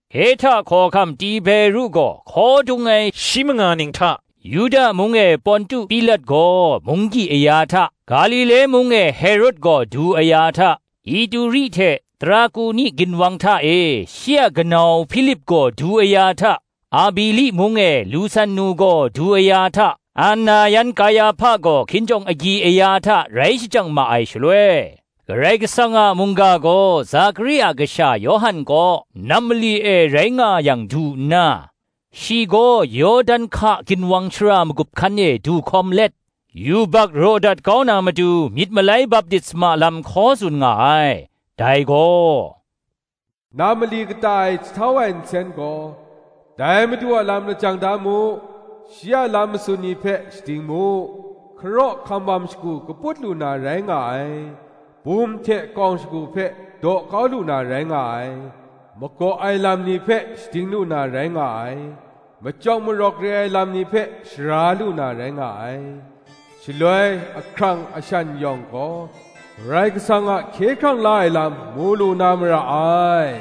Kehta hkawhkam Tiberu gaw hkaw dung ai shi manga ning hta, Yuda mung e Puntu Pilat gaw munggyi aya hta, Galile mung e Herod gaw du aya hta, Ituri hte Trakuni ginwang hta e shi a kanau Hpilip gaw du aya hta, Abili mung e Lusanu gaw du aya hta, Anna yan Kayahpa gaw hkinjawng agyi aya hta rai shajang ma ai shaloi, Karai Kasang a mungga gaw Zakari a kasha Yawhan kaw, nam mali e rai nga yang du nna, shi gaw Yawdan hka ginwang shara magup hkan e du hkawm let, yubak raw dat kau na matu myit malai baptisma lam hkaw tsun nga ai: dai gaw, “Nam mali kata e jahtau ai nsen gaw: Dai Madu a lam lajang da mu, Shi a lam masun ni hpe shading mu: Hkaraw hkamwam shagu kaput lu na rai nga ai, Bum hte kawng shagu hpe daw kau lu na rai nga ai; Magaw ai lam ni hpe shading lu na rai nga ai, Machyawk marawk re ai lam ni hpe shara lu na rai nga ai: Shaloi ahkrang ashan yawng gaw, Karai Kasang a hkye hkrang la ai lam mu lu na mara ai,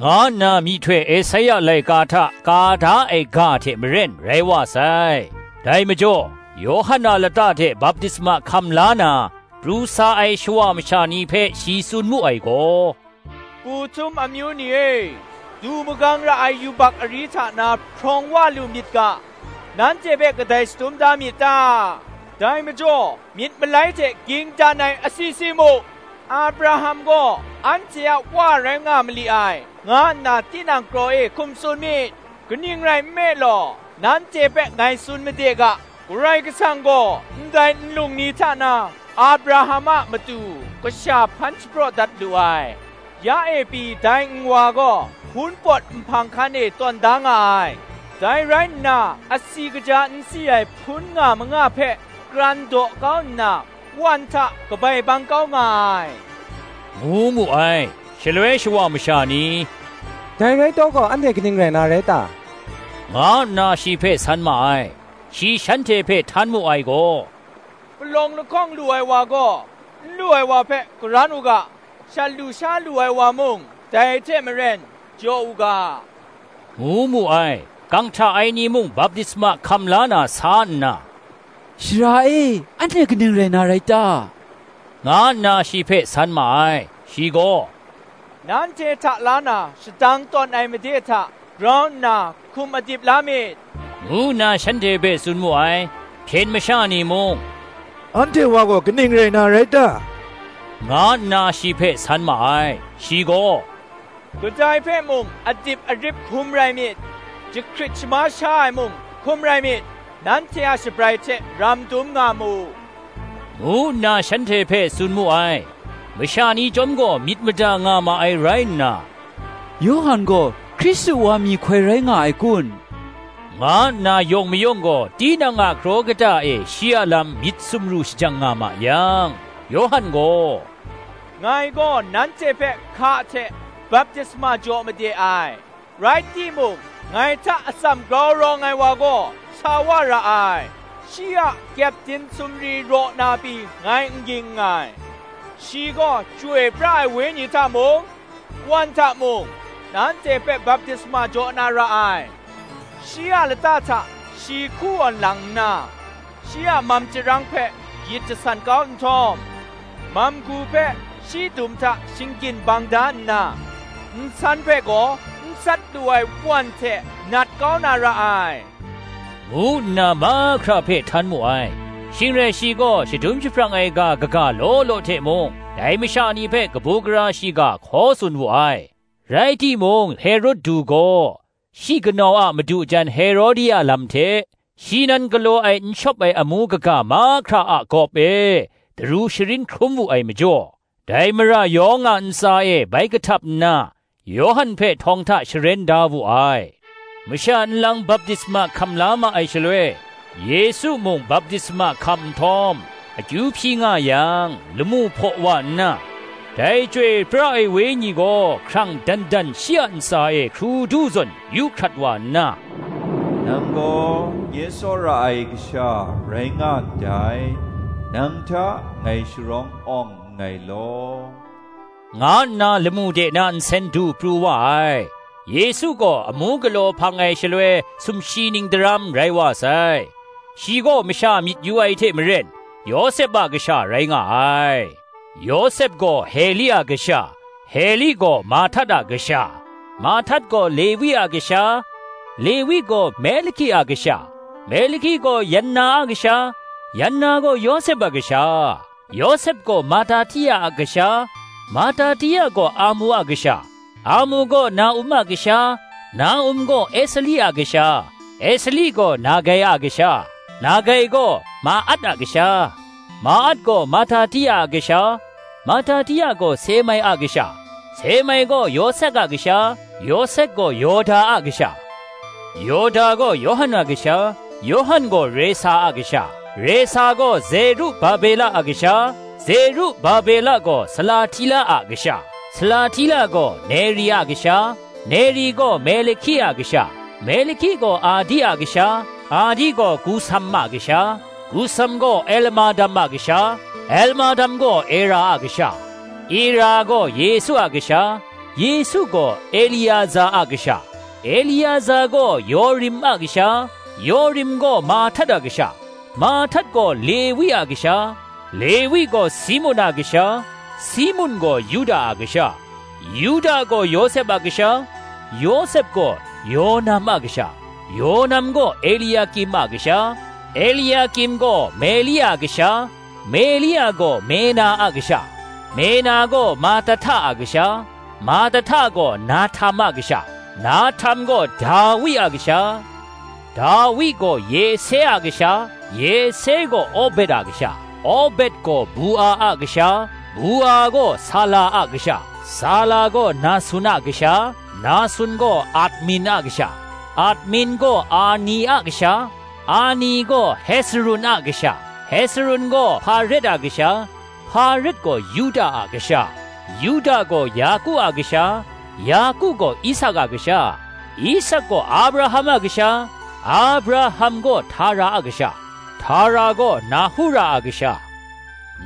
nga nna myihtoi Esaia laika hta ka da ai ga hte maren rai wa sai. Dai majaw, Yawhan a lata hte baptisma hkam la na, pru sa ai shawa masha ni hpe shi tsun mu ai gaw: “Pu htum amyu ni e, du magang ra ai yubak ari hta na hprawng wa lu myit ga, nanhte hpe kadai shadum da myit ta? Dai majaw myit malai hte ging dan ai asi si mu! Abraham gaw anhte a wa rai nga mali ai, nga nna tinang kraw e hkum tsun myit; kaning rai nme law, nanhte hpe ngai tsun made ga, Karai Kasang gaw ndai nlung ni hta na Abraham a matu kasha hpan shapraw dat lu ai. Ya e pyi dai nwa gaw hpun pawt nhpang hkan e tawn da nga ai; dai rai nna asi kaja n si ai hpun nga manga hpe kran daw kau nna wan hta kabai bang kau nga ai,” ngu mu ai. Shaloi shawa masha ni, “Dai rai taw gaw, anhte kaning rai na rai ta?” nga nna shi hpe san ma ai. Shi shanhte hpe htan mu ai gaw, “Palawng lahkawng lu ai wa gaw n lu ai wa hpe karan u ga, shat lusha lu ai wa mung dai hte maren jaw u ga,” ngu mu ai. Kang hta ai ni mung baptisma hkam la na sa nna, “Sara e, anhte kaning rai na rai ta?” nga nna shi hpe san ma ai. Shi gaw, “Nanhte hta la na shadang tawn ai made hta grau nna hkum adip la myit,” ngu nna shanhte hpe tsun mu ai. Hpyen masha ni mung, “Anhte wa gaw kaning rai na rai ta?” nga nna shi hpe san ma ai. Shi gaw, “Kadai hpe mung adip arip hkum rai myit: jahkrit shama sha ai mung hkum rai myit; nanhte a shabrai hte ram dum nga mu,” ngu nna shanhte hpe tsun mu ai. Masha ni chyawm gaw myit mada nga ma ai rai nna, Yawhan gaw Hkristu wa mi hkoi rai nga ai kun? nga nna yawng mayawng gaw tinang a kraw kata e shi a lam myit sumru shajang nga ma yang; Yawhan gaw, “Ngai gaw nanhte hpe hka hte baptisma jaw made ai; rai timung, ngai hta atsam grau rawng ai wa gaw sa wa ra ai; shi a kyepdin sumri raw na pyi ngai n ging nngai: shi gaw Chyoi pra ai Wenyi hta mung, wan hta mung, nanhte hpe baptisma jaw na ra ai: shi a lata hta shi hkuwawn lang nna, shi a mam chyarang hpe yit jasan kau nhtawm, mam gu hpe shi dum hta shinggyin bang da nna, nsan hpe gaw n sat lu ai wan hte nat kau na ra ai,” ngu nna mahkra hpe htan mu ai. Shing rai shi gaw shadum jahprang ai ga kaga law law hte mung, dai masha ni hpe kabu gara shiga hkaw tsun wu ai: rai timung Herod du gaw, shi kanau a madu jan Herodia lam hte, shi nan galaw ai n shawp ai amu kaga mahkra a gawp e daru sharin hkrum wu ai majaw, dai mara yawng a ntsa e bai kahtap nna, Yawhan hpe htawng hta sharen da wu ai. Masha nlang baptisma hkam la ma ai shaloi, Yesu mung baptisma hkam nhtawm, akyu hpyi nga yang, lamu hpaw wa nna, dai Chyoi pra ai Wenyi gaw hkrang dan dan shi a ntsa e hkrudu zawn yu hkrat wa nna, “Nang gaw nye tsawra ai Kasha rai nga ndai; nang hta ngai sharawng awng nngai law,” nga nna lamu de na nsen du pru wa ai. Yesu gaw amu galaw hpang ai shaloi sumshi ning daram rai wa sai; shi gaw masha myit yu ai hte maren, Yawsep a kasha rai nga ai: Yawsep gaw Heli a kasha; Heli gaw Mahtat a kasha; Mahtat gaw Lewi a kasha; Lewi gaw Melhki a kasha; Melhki gaw Yanna a kasha; Yanna gaw Yawsep a kasha; Yawsep gaw Matahtia a kasha; Matahtia gaw Amu a kasha: Amu gaw Na-um a kasha; Na-um gaw Esali a kasha; Esali gaw Nagai a kasha Nagai gaw Ma-at a kasha; Ma-at gaw Matahtia a kasha: Matahtia gaw Semai a kasha; Semai gaw Yosek a kasha; Yosek gaw Yoda a kasha; Yoda gaw Yawhan a kasha; Yawhan gaw Resa a kasha; Resa gaw Zerubabela a kasha; Zerubabela gaw Salahtila a kasha; Salahtila gaw Neri a kasha; Neri gaw Melhki a kasha; Melhki gaw Adi a kasha; Adi gaw Kusam a kasha; Kusam gaw Elamadam a kasha; Elamadam gaw Era a kasha; Era gaw Yesu a kasha; Yesu gaw Elieza a kasha; Elieza gaw Yawrim a kasha; Yawrim gaw Mahtat a kasha; Mahtat gaw Lewi a kasha; Lewi gaw Simun a kasha; Simun gaw Yuda a kasha; Yuda gaw Yawsep a kasha; Yawsep gaw, Yawnam a kasha; Yawnam gaw Eliakim a kasha; Eliakim gaw Melia a kasha; Melia gaw Mena a kasha; Mena gaw Matahta a kasha; Matahta gaw Nahtam a kasha; Nahtam gaw Dawi a kasha; Dawi gaw Yese a kasha; Yese gaw Obed a kasha; Obed gaw Bua a kasha; Bua gaw Sala a kasha; Sala gaw Nasun a kasha; Nasun gaw Admin a kasha; Admin gaw Arni a kasha; Arni gaw Hesrun a kasha; Hesrun gaw Hparet a kasha; Hparet gaw Yuda a kasha; Yuda gaw Yaku a kasha; Yaku gaw Isak a kasha; Isak gaw Abraham a kasha; Abraham gaw Htera a kasha; Htera gaw Nahura a kasha;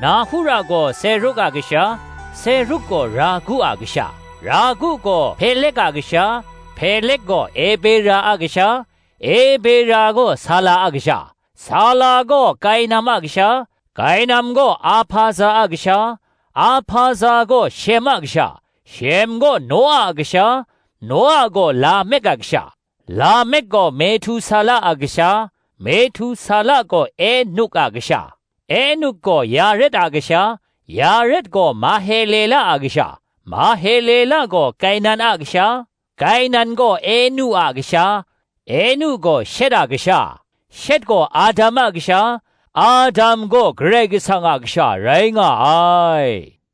Nahura gaw Seruk a kasha; Seruk gaw Ragu a kasha; Ragu gaw Hpelek a kasha; Hpelek gaw Ebera a kasha; Ebera gaw Sala a kasha; Sala gaw Kainam a kasha; Kainam gaw Arhpaza a kasha; Arhpaza gaw Shem a kasha; Shem gaw Noa a kasha; Noa gaw Lamek a kasha; Lamek gaw Mehtusala a kasha; Mehtusala gaw Enuk a kasha; Enuk gaw Yaret a kasha; Yaret gaw Mahelela a kasha; Mahelela gaw Kainan a kasha; Kainan gaw Enu a kasha; Enu gaw Shet a kasha; Shet gaw Adam a kasha; Adam gaw Karai Kasang a kasha rai nga ai.